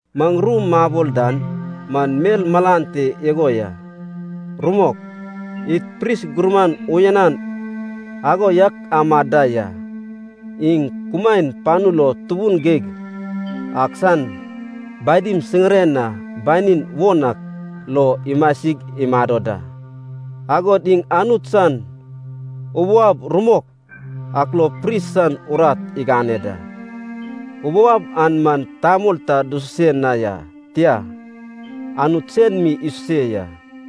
Maŋ ru mabol dan man mel malan te igo ya: rumok, id pris gurman uyanan ago yak amad da ya. Iŋ kumaen panu lo Tubun Geig ak san badim siŋiren na banin won ak lo imasig imado da. Agod iŋ Anut san ubou ab rumok ak lo pris san urat igane da. Ubou ab an man tamol ta dususe na ya, tia, Anut sen mi isuse ya.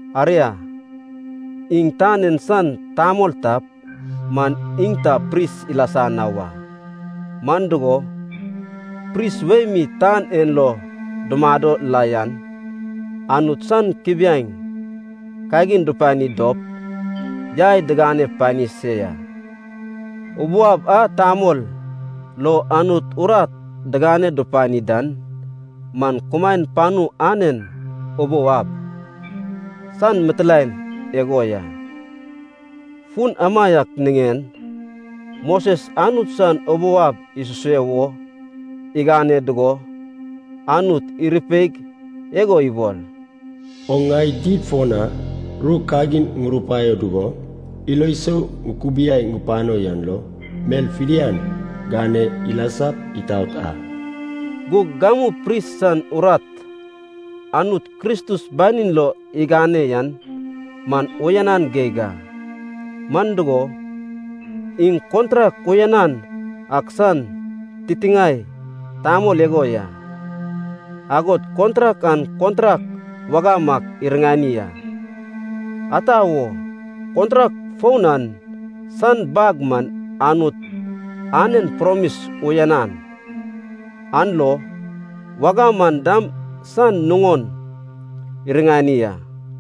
Aria, iŋ tan en san tamol tap man iŋ ta pris ilasa na wa. Man dugo, pris wei mi tan en lo dumado la yan, Anut san kubiaeŋ kagin dupani dop yai digane pani se ya. Ubou ab a tamol, lo Anut urat digane dupani dan man kumaen panu anen ubou ab san mitilaen igo ya. Fun amaiak niŋen Moses Anut san ubou ab isuse wo igane dugo, Anut irupeig igo ibol, “Oŋ ŋai did fo na ru kagin ŋurupaio dugo ilo sou ŋukubiai pano yan lo, mel fidian gane ilasap itaot a.” Gug gamu pris san urat Anut Kristus banin lo igane yan man uyanan geig a. Man dugo, iŋ kontrak uyanan ak san titiŋae tamol igo ya, agod kontrak an kontrak wagam ak iriŋani a. Ata wo, kontrak foun an san bag man Anut anen promis uyanan, an lo wagam an dam san nuŋon iriŋani a.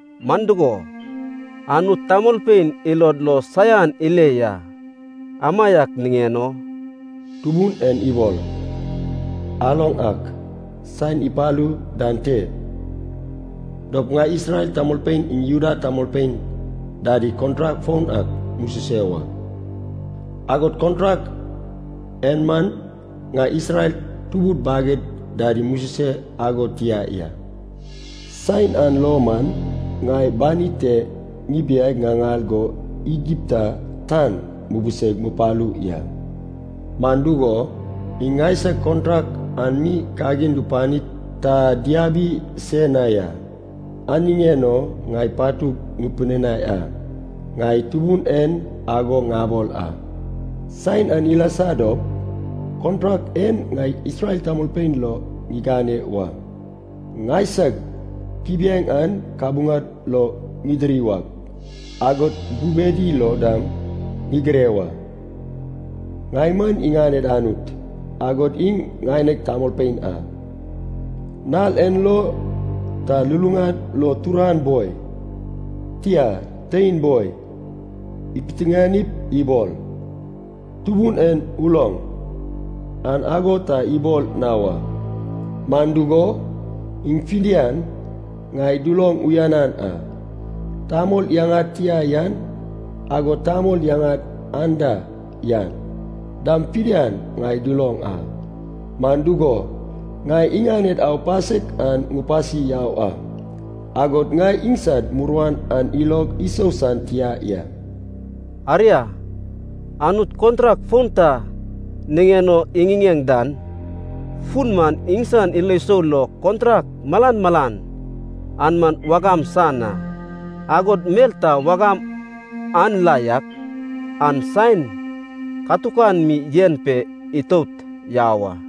Man dugo, Anut tamolpein ilod lo saian ile ya, amaiak niŋen o, “Tubun en ibol, aloŋ ak, saen ipalu dan te dop ŋai Isrel tamolpein iŋ Juda tamolpein dadi kontrak foun ak mususe wa. Agod kontrak en man ŋai Isrel tubud baged dadi mususe ago tia ya. Saen an lo man ŋai banid te ŋibiaig ŋaŋal go Igipta tan mubiseig mupalu ya. Man dugo, iŋ ŋaisag kontrak an mi kagin dupanip ta diabi se na ya. An niŋen o ŋai patug ŋipidinai a. Ŋai Tubun en ago ŋabol a. Saen an ilasa dop, kontrak en ŋai Isrel tamolpein lo ŋigane wa. Ŋaisag kubiaeŋ an kabuŋad lo ŋidiri wak, agod bubedi lo dam ŋigire wa. Ŋai man iŋaned Anut, agod iŋ ŋaineg tamolpein a. Nal en lo ta luluŋad lo turan boi, tia, tein boi, ipiteŋanip ibol, ‘Tubun en uloŋ,’ an ago ta ibol na wa. Man dugo, iŋ fidian ŋai duloŋ uyanan a. Tamol yaŋad tia yan, agod tamol yaŋad anda yan, dam fidian ŋai duloŋ a. Man dugo, ŋai iŋaned aupasek an ŋupasi yau a, agod ŋai iŋsad muruan an ilog isou san tia ya.” Aria, Anut kontrak foun ta niŋen o iŋiŋeŋ dan fun man iŋsan ilo sou lo kontrak malan malan an man wagam san a. Agod mel ta wagam an la yak, an saen katukan mi yen pe itout yau a.